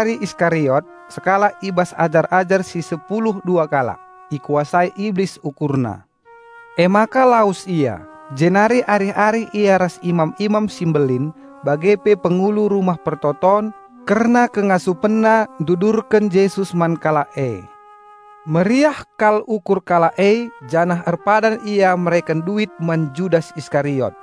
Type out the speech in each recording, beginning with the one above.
Judas, si igelari Iskariot sekalak i bas ajar-ajar si sepulu dua kalak, ikuasai Iblis ukurna. Emaka lawes ia, jenari arih-arih ia ras imam-imam si mbelin bage pe pengulu Rumah Pertoton kerna kengasupenna ndudurken Jesus man kalak e. Meriah kal ukur kalak e janah erpadan ia mereken duit man Judas Iskariot.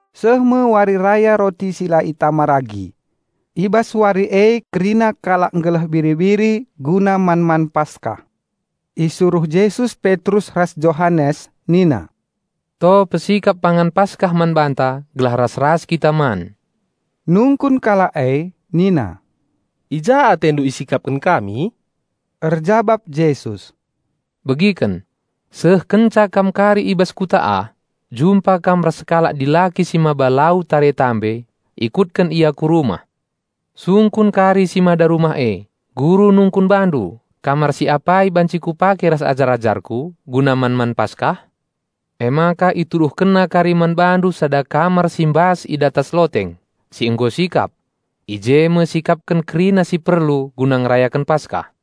Seh me Wari Raya Roti si la erragi. I bas wari e kerina kalak nggeleh biri-biri guna man-man Paskah. Isuruh Jesus Petrus ras Johanes nina, "To pesikap pangan Paskah man banta gelah ras-ras kita man." Nungkun kalak e nina, "I ja atendu isikapken kami?" Erjabap Jesus, "Begiken! Seh kenca kam kari i bas kuta ah, jumpa kam ras sekalak dilaki si mbaba lau tare guci. Ikutken ia ku rumah. Sungkun kari si mada rumah e, Guru nungkun bandu, 'Kamar si apai banci Kupake ras ajar-ajarKu guna man-man Paskah?' Emaka ituduhkenna kari man bandu sada kamar si mbas i datas loteng, si nggo sikap. I je me sikapken kerina si perlu guna ngerayaken Paskah."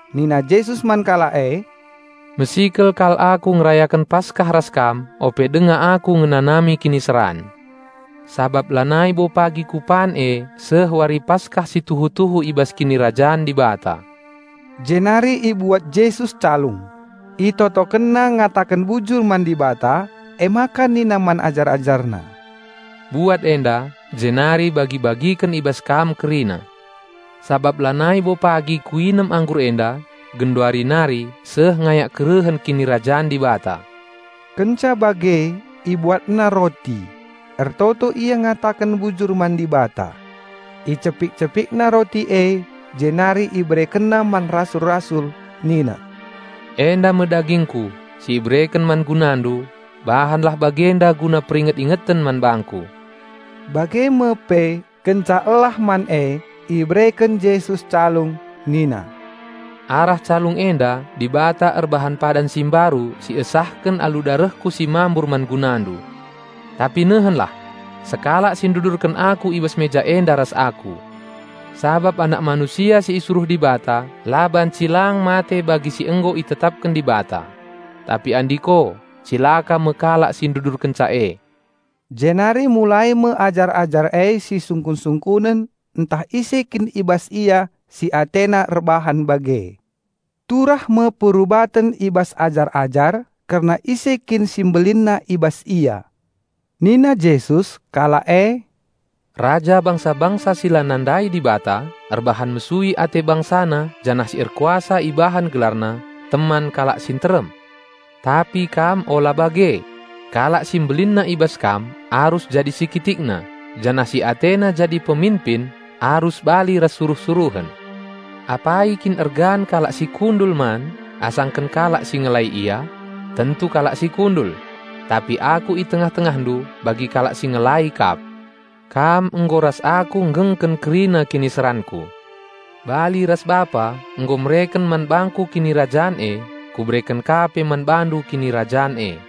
Nina Jesus man kalak e, "Mesikel kal aku ngerayaken Paskah ras kam ope denga Aku ngenanami kiniseran. Sabap lanai bo pagi kupan e seh Wari Paskah si tuhu-tuhu i bas Kinirajan Dibata." Jenari ibuat Jesus calung, ItotokenNa ngataken bujur man Dibata, emaka nina man ajar-AjarNa, "Buat enda, jenari bagi-bagiken i bas kam kerina. Sabap lanai bo pagi kuinem anggur enda, genduari nari seh ngayak kerehen Kinirajan Dibata." Kenca bage IbuatNa roti, ertoto Ia ngataken bujur man Dibata. Icepik-CepikNa roti e jenari IberekenNa man rasul-rasul nina, "Enda me dagingKu (si ibereken man gunandu. Bahanlah bagenda guna peringet-ingeten man bangKu." Bage me pe, kenca elah man e ibereken Jesus calung nina, "Arah calung enda Dibata erbahan Padan si Mbaru si iesahken alu darehKu si mambur man gunandu.) Tapi, nehenlah! Sekalak si ndudurken Aku i bas meja enda ras Aku. Sabap Anak Manusia si isuruh Dibata la banci lang mate bagi si nggo itetapken Dibata. Tapi andiko, cilaka me kalak si ndudurkenca e!" Jenari mulai me ajar-ajar e sisungkun-sungkunen ntah ise kin i bas ia si atena erbahan bage. Turah me perubaten i bas ajar-ajar kerna ise kin si mbelinna i bas ia. Nina Jesus kalak e, "Raja bangsa-bangsa si la nandai Dibata erbahan mesui ate bangsana janah si erkuasa ibahan gelarna 'Teman Kalak si nterem.' Tapi kam ola bage; kalak si mbelinna i bas kam arus jadi si kitikna, janah si atena jadi peminpin arus bali ras suruh-suruhen. Apai kin ergan kalak si kundul man asangken kalak si ngelai ia? Tentu kalak si kundul. Tapi Aku i tengah-tengahndu bagi kalak si ngelai kap. Kam nggo ras Aku nggengken kerina kiniseranKu. Bali ras Bapa nggo mereken man bangKu Kinirajan e, Kubereken ka pe man bandu Kinirajan e.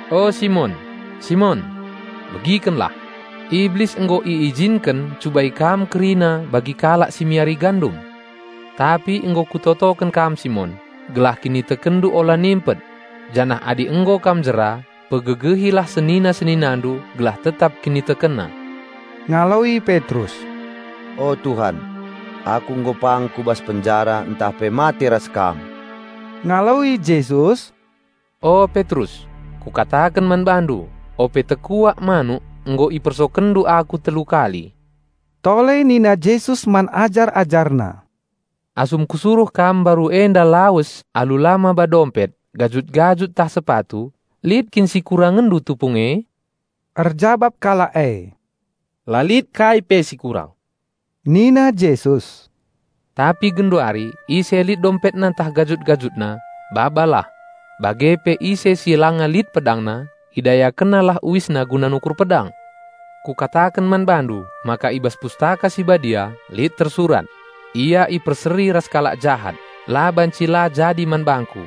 "O, Simon, Simon! Begikenlah! Iblis nggo iijinken ncubai kam kerina bagi kalak si miari gandum. Tapi nggo Kutotoken kam Simon, gelah kinitekenndu ola nimpet. Janah adi nggo kam jera, pegegehilah senina-seninandu gelah tetap kinitekenna." Ngaloi Petrus, "O Tuhan, aku nggo pang ku bas penjara ntah pe mate ras Kam." Ngaloi Jesus, "O Petrus, Kukataken man bandu: Ope tekuak manuk nggo ipersokendu Aku telu kali." Tole nina Jesus man ajar-AjarNa, "Asum Kusuruh kam mbaru enda lawes alu la maba dompet, gajut-gajut ntah sepatu, lit kin si kurangenndu tupung e?" Erjabap kalak e, "La lit kai pe si kurang." Nina Jesus, "Tapi genduari ise lit dompetna ntah gajut-gajutna, babalah. Bage pe ise si langa lit pedangna, idayakennalah uisna guna nukur pedang. Kukataken man bandu maka i bas Pustaka Si Badia lit tersurat 'Ia iperseri ras kalak jahat' la baci la jadi man Bangku.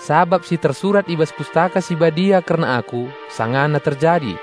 Sabap si tersurat i bas Pustaka Si Badia kerna Aku sangana terjadi."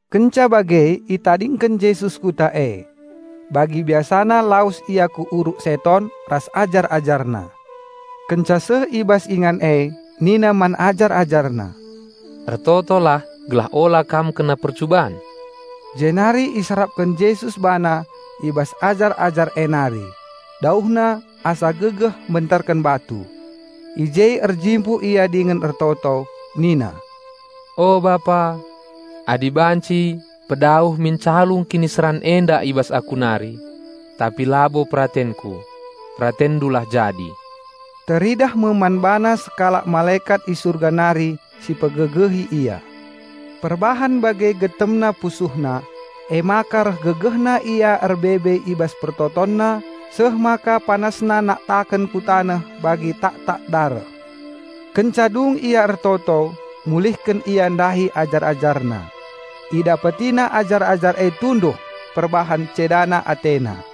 Kenca bage itadingken Jesus kuta e. Bagi biasana lawes Ia ku Uruk Seton ras ajar-AjarNa. Kenca seh i bas ingan e nina man ajar-AjarNa, "Ertotolah gelah ola kam kena percuban." Jenari iserapken Jesus BaNa i bas ajar-ajar e nari, dauhna asa gegeh mbenterken batu. I je erjimpuh Ia dingen ertoto, nina, "O Bapa, adi banci pedauh min calung kiniseran enda i bas Aku nari. Tapi labo peratenKu, PeratenNdulah jadi." (Teridah me man BaNa sekalak malekat i Surga nari si pegegehi Ia. Perbahan bage getemna PusuhNa, emaka reh gegehna Ia erbebe i bas PertotonNa seh maka PanasNa naktaken ku taneh bagi taktak dareh.) Kenca dung Ia ertoto mulihken Ia ndahi ajar-AjarNa. IdapetiNa ajar-ajar e tunduh perbahan cedasa atena.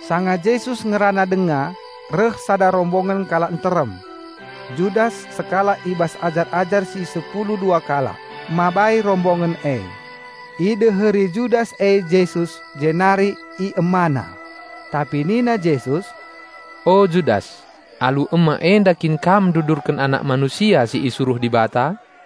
Sanga Jesus ngerana denga, reh sada rombongen kalak nterem. Judas, sekalak i bas ajar-ajar si sepulu dua kalak, mabai rombongen e. Ideheri Judas e Jesus jenari iemana. Tapi nina Jesus, "O, Judas, alu ema enda kin kam ndudurken Anak Manusia si isuruh Dibata?"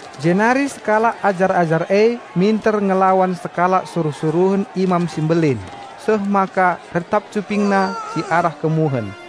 Jenari sekalak ajar-ajar e minter ngelawan sekalak suruh-suruhen Imam si Mbelin seh maka retap cupingna si arah kemuhen.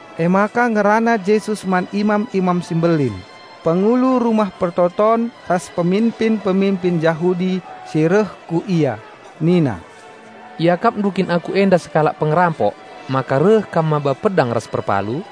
Emaka ngerana Jesus man imam-imam si mbelin, pengulu Rumah Pertoton ras peminpin-peminpin Jahudi si reh ku Ia nina, "Iakapndu kin Aku enda sekalak pengerampok maka reh kam maba pedang ras perpalu?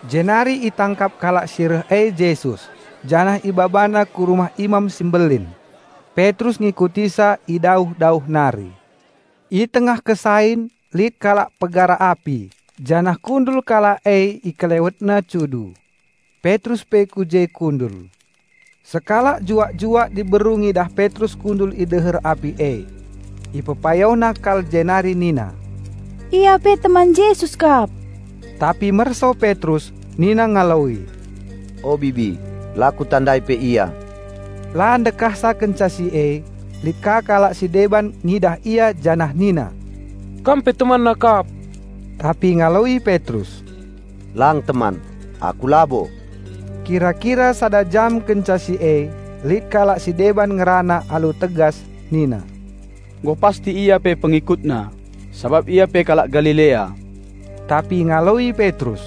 Jenari itangkap kalak si reh e Jesus janah ibabana ku rumah Imam si Mbelin. Petrus ngikutisa i dauh-dauh nari. I tengah kesain lit kalak pegara api janah kundul kalak e i kelewetna cudu. Petrus pe ku je kundul. Sekalak juak-juak diberu ngidah Petrus kundul i deher api e. Ipepayona kal jenari nina, "Ia pe teman Jesus kap!" Tapi merso Petrus nina ngaloi, "O bibi, la kutandai pe Ia!" La ndekahsa kenca si e, lit ka kalak si deban ngidah ia janah nina, "Kam pe TemanNa kap!" Tapi ngaloi Petrus, "Lang teman, aku labo!" Kira-kira sada jam kenca si e, lit kalak si deban ngerana alu tegas nina, "Nggo pasti ia pe PengikutNa, sabap ia pe kalak Galilea!" Tapi ngaloi Petrus,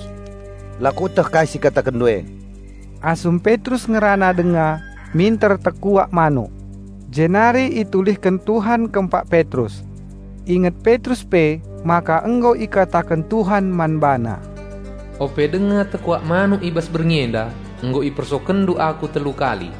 "La kueteh kai si ikatakenndu e!" Asum Petrus ngerana denga minter tekuak manuk. Jenari itulihken Tuhan kempak Petrus. Inget Petrus pe maka nggo ikataken Tuhan man bana, "Ope denga tekuak manuk i bas berngi enda, nggo ipersokenndu Aku telu kali."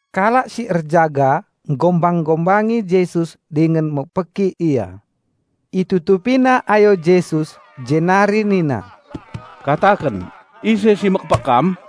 Kalak si erjaga nggombang-gombangi Jesus dingen mekpeki Ia. Itutupina ayo Jesus jenari nina, "Kataken, ise si mekpek Kam?"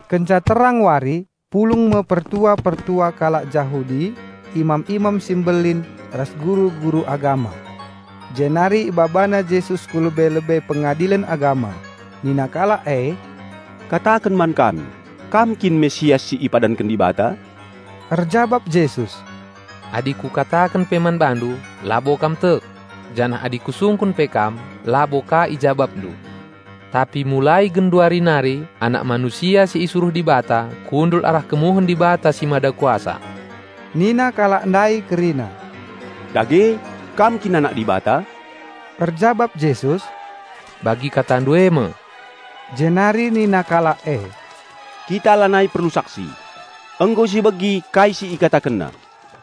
Kenca terang wari pulung me pertua-pertua kalak Jahudi, imam-imam si mbelin ras guru-guru agama. Jenari ibabana Jesus ku lebe-lebe Pengadilen Agama. Nina kalak e, "Kataken man kami, Kam kin Raja Penampat si ipadanken Dibata?" Erjabap Jesus, "Adi Kukataken pe man bandu, labo kam tek. Janah adi Kusungkun pe kam, labo ka ijabapndu. Tapi mulai genduari nari Anak Manusia si isuruh Dibata kundul arah kemuhen Dibata si Mada Kuasa." Nina kalak ndai kerina, "Dage, Kam kin Anak Dibata?" Erjabap Jesus, "Bagi katandu e me!" Jenari nina kalak e, "Kita lanai perlu saksi! Nggo si begi kai si IkatakenNa."